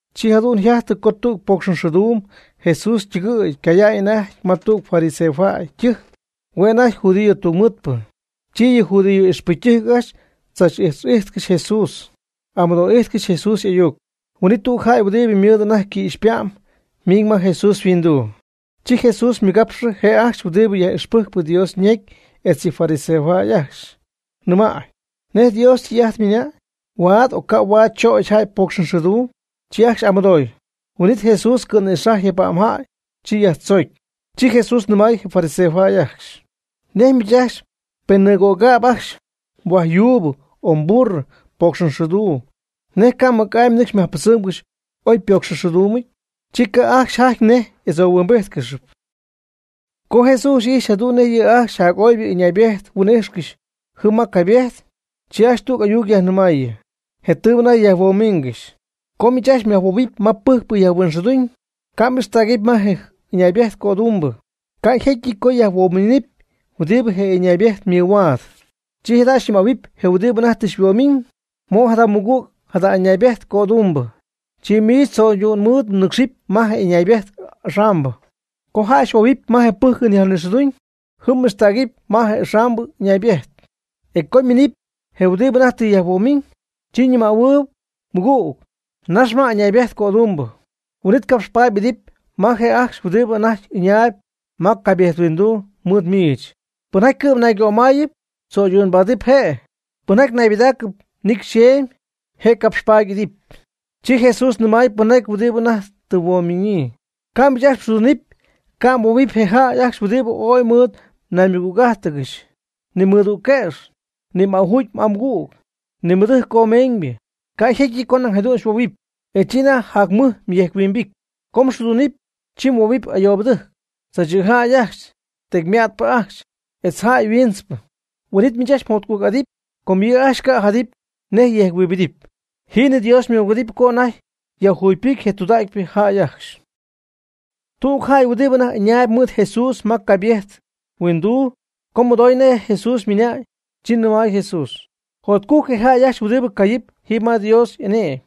Chi jadu'n yjajtɨ co tüg pocxxɨɨduum Jesús ytɨgɨy ycaya'ñ anajty ma tüg fariseojäy ytɨjc, hue' anajty judío tungmɨɨdpɨ. Chi yɨ judío ixpɨcytɨjc ajcxy tzach'ix'ijtcɨxy Jesús, amɨdoo'ijtcɨxy Jesús y'ayuc. Huin'it tüg jäy huɨdibɨ ymɨɨd anajty quïxypa'm miiñ ma Jesús yhuinduu. Chi Jesús ymɨgapxɨ je' ajcxy huɨdibɨ yaj'ixpɨjc Dios ñecy etz yɨ fariseojäy ajcxy, nɨmay: ―¿Nej je Dios ytɨy'ajt ymɨnañ? ¿Huaad o ca' huaad chögy jäy pocxxɨɨduum? Chi ajcxy y'amonday. Huin'it Jesús cɨ̈nïxajɨɨy je pa'm jäy, chi yajtzoocy. Chi Jesús nɨmay je fariseos ajcxy: ―¿Nej miich ajcxy pen nɨɨjutcögäp ajcxy mhuajyuubɨ o mburro pocxxɨɨduum, nej ca' mɨc'amy nɨcxy yajpɨdzɨmgɨxy oy ypocxxɨɨduumɨ? Chi ca' ajcxy jajty nej y'adzohuimbíjtcɨxɨpy. Co Jesús ijxy jadu'n nej yɨ' ajcxy jac'oybɨ ɨñaybejt huin'ijxcɨxy jɨm ma je caybejt, chi ajcxy tüg ayuc yajnɨmaayɨ, je tɨɨbɨ anajty yajhuomiingɨxy: ―Co miich myajhuoohuɨpy ma pɨjcpɨ yajnixɨɨduñ, ca' m'ixtägɨpy ma je ɨñaybejt cödumbɨ, ca' jécyɨty co yajhuoomiñ huɨdi je' ɨñaaybejt ymɨhuaad. Chi jada' xyñɨmähuɨpy je huɨdibɨ anajty tɨ xyhuoomiñ: “Mo' jada mɨgüg jada ɨñaaybejt cödumbɨ.” Chi miich tzöydu'n mɨɨd mnɨcxpy ma je' ɨñaybejt axambɨ. Co jäy xyhuohuɨpy ma je pɨ́jcɨn yajnixɨɨduñ, jɨm m'ixtägɨp ma je axambɨ ɨñaybejt, e co yminɨpy je huɨdibɨ anajty tɨ xyhuomiñ, chi xyñɨmähuɨpy: “Mɨgüg, nax ma yɨ ɨñaybejt cödumbɨ.” Huin'it capxpaady m'idɨpy ma je' ajcxy huɨdibɨ anajty ɨñayb ma caybejthuinduu mɨɨd miich. Pɨnjaty cɨ'm naygömáyɨp, tzöydu'nbaadɨp je'. Pɨnjaty naybɨdaacɨp nicy xeemy je' je' capxpaady y'idɨp. Chi Jesús nɨmay pɨnjaty huɨdi anajty tɨ yhuoomiñyii: ―Co miich mxɨɨduunɨpy ca' mhuoohuɨpy je jäy ajcxy huɨdibɨ ooy mɨɨd mnaymɨgüg'ájtɨgɨxy, ni mmɨdügquëx, ni m'ajuugy m'amɨgüg, ni mmɨdɨjc comeeñybɨ, ca' jécyɨty co nañ jadu'n xyhuohuɨpy, e chi anajty jac mɨj yejc-huimbijty. Co mxɨɨdunɨpy, chi huoohuɨpy ayoobɨtɨjc, tzaachɨ̈jäy ajcxy, tecymätpɨ ajcxy, etz jäy huiintzpɨ. Huin'it miich mjotcujc'adɨpy co yɨ' ajcxy ca' jadɨpy nej yejc-huimbidɨpy. Jiinɨ Dios xymɨgüedɨpy co anajty yajjugypɨcy je tudägypɨ jäy ajcxy. Tüg jäy huɨdi anajty ɨñaayb mɨɨd Jesús ma caybejt huinduu co mɨdooy nej Jesús ymɨnañ, chi nɨmay Jesús: ―Jotcujc je jäy ajcxy huɨdi cayɨp jiiby ma Dios y'ane'my.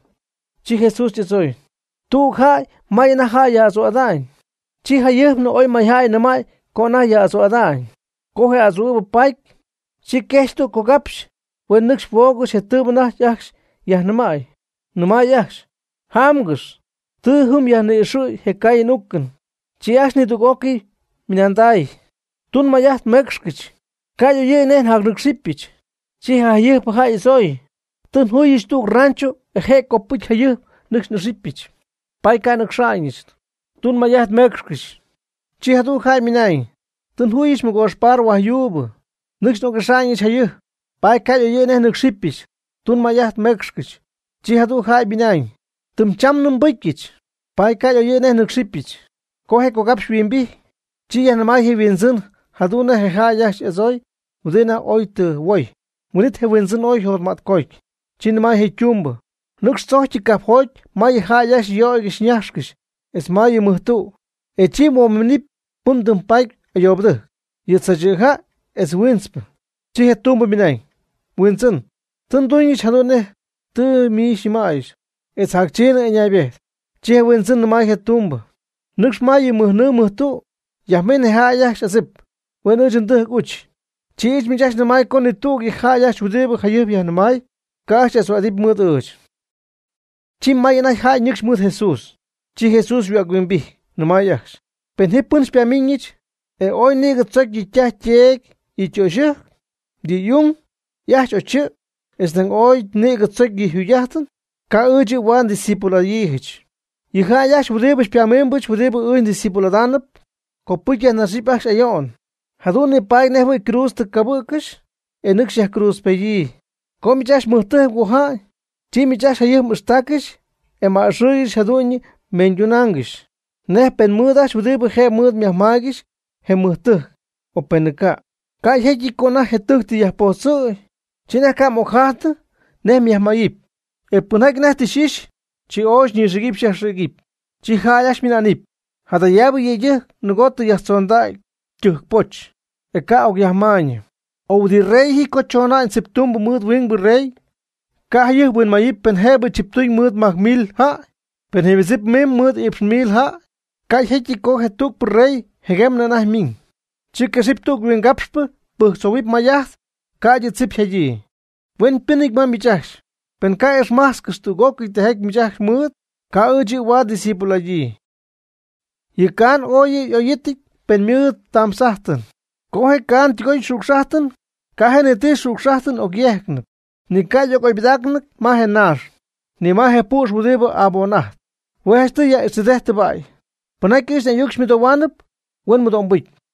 Chi Jesús y'adzooy: ―Tüg jäy may anajty jäy yaj'adzu'ada'ñ, chi jayɨjpnɨ oy mayjäy nɨmay co anajty yaj'adzuu'ada'ñ. Co je adzuu'ɨ̈bɨ paty, chi quejxy tüg cogapxy huen nɨcxy huoogɨxy je tɨɨbɨ anajty ajcxy yajnɨmäy, nɨmay ajcxy: “Jámgɨx, tɨ jɨm yajni'ixɨ̈y je caayɨn uucɨn.” Chi ajcxy nidüg'ócɨy ymɨnandacy: “Tun may'ajt meecxcɨch, ca' y'oyɨ̈y nej nyajnɨ́cxɨbɨch.” Chi je' jayɨjp jäy y'adzoy: “Tɨ njuyɨch tüg rancho je' copɨcy jayɨjp nɨcxy n'ixyɨch, paady ca' nɨcxa'ñɨch; tun may'ajt meecxcɨch.” Chi jadüg jäy ymɨnañ: “Tɨ njuyɨch mɨgoox par huaj yuubɨ, nɨcxy n'oc'ijxmadza'ñɨch jayɨjp, paady ca' y'oyɨ̈y nej nɨ́cxɨbyɨch, tun may'ajt meecxcɨch.” Chi jadüg jäy ymɨnañ: “Tɨm chamnɨ nbɨcyɨch, paady ca' oyɨ̈y nej nɨ́cxɨbyɨch.” Co je cogapxy yhuimbijty, chi yajnɨmay je' yhuindzɨn jadu'n nej je jäy ajcxy y'adzooy huɨdi anajty oy tɨ huoy. Huin'it je huindzɨn ooy yjotmätcoty, chi nɨmay je ytumbɨ: “Nɨcx tzojcyɨ cajpjoty ma yɨ jäy ajcxy yöygɨxy ñajxcɨxy etz ma yɨ mɨj tü, e chi huomiinɨpy pɨn mdɨmypaatyp ayoobɨtɨjc, yɨ tzaachɨ̈jäy etz huiintzpɨ.” Chi je' ytumbɨ ymɨnañ: “Huindzɨn, tɨ nduñɨch jadu'n nej tɨ xyñɨmäyɨch, etz jac chiinɨ ɨñaybejt.” Chi je huindzɨn nɨmay je' ytumbɨ: “Nɨcx ma yɨ mɨj nɨɨ mɨj tü yajmin je jäy ajcxy adzip, huen ɨɨch ndɨjc uch. Chi ɨɨch miich nɨmäy co ni tüg yɨ jäy ajcxy huɨdi jayɨjp yajnɨmay, ca' ajcxy y'adzuu'adɨpy mɨɨd ɨɨch.” Chi may anajty jäy ñɨcxy mɨɨd Jesús, chi Jesús yhuäc-huimbijty, nɨmay ajcxy: ―Pen ji pɨn xypamiiñɨch, e ooy nïgɨ tzocy yɨ' ytaj yteedy, yɨ' ytöxyɨjc, yɨ' y'ung, y'ajch o chɨ', etz nañ ooy nïgɨ tzocy yɨ' yjugy'ájtɨn, ca' ɨɨch yɨ' huaad ndiscípulo'adyiijɨch. Yɨ jäy ajcxy huɨdi xypamiimbɨch huɨdi ɨɨch ndiscípulo'adaanɨp, copɨcy yajnaxɨpy ajcxy ayo'n, jadu'n nipaady nejjɨhuɨ̈y ycruudz tɨ cabɨ̈ccɨxy e nɨcxy yajcruudzpeda'ñyii. Co miich ajcxy mmɨjtɨjc mgoja'ñ, chi miich ajcxy jayɨjp m'ixtaaccɨxy e m'a'ɨxɨɨygɨxy jadu'ñyɨ meeñydunaangɨxy, nej pen mɨɨd ajcxy huɨdi jëbɨ mɨɨd myajmaaygɨxy je mmɨjtɨjc, o penɨ ca'. Ca' yjécyɨty co anajty je tɨjc tɨ yajpojtzɨ̈gy, chi anajty ca' m'ocjajtnɨ nej myajmayɨpy, e pɨnjaty anajty tɨ xy'ixy, chi ooy xyñɨxïgɨpy xyajxïgɨpy. Chi jäy ajcxy ymɨna'nɨp: “Jadayaabɨ yëydɨjc nɨgoo tɨ yajtzondägy tɨjc poch, e ca' tɨ ocyajmaayñɨ.” O huɨdi rey ji co chona'ñ tziptumbɨ mɨɨd huingbɨ rey, ¿ca' jayɨjp huinmayɨpy pen jëbɨ chiptuñ mɨɨd majc mil jäy, pen je ymɨdzip miimb mɨɨd iipx mil jäy? Ca' yjécyɨty co je tügpɨ rey jɨguemnɨ anajty miiñ, chi quexɨpy tüg huingapxpɨ pɨjctzohuɨpy may'ajt ca'ydɨ yɨ tzip yjadyii. Hueñypɨ́nɨty ma miich ajcxy pen ca' m'ixmájtzcɨxy tüg'ócɨy tijaty miich ajcxy mmɨɨd, ca' ɨɨch yɨ' huaad ndiscípulo'adyii. Yɨ caan ooy yɨ' y'óyɨty pen ymɨɨd ytamtz'ájtɨn. Co je caan ytɨgoy ytamtz'ájtɨn ca' ji ni ti xücx'ájtɨn yegɨpy. Yɨ caan huɨdi tɨ ytɨgoy ytamtz'ájtɨn ni ca' y'oybɨdägnɨty ma je naax, ni ma je püx huɨdi aboon'ajtp. Hue' janchtɨy yaj'ixjɨdejtp tɨbäy. Pɨnjaty ɨɨch n'ayuc xymɨdohuaanɨp huen mɨdo'mbɨcy.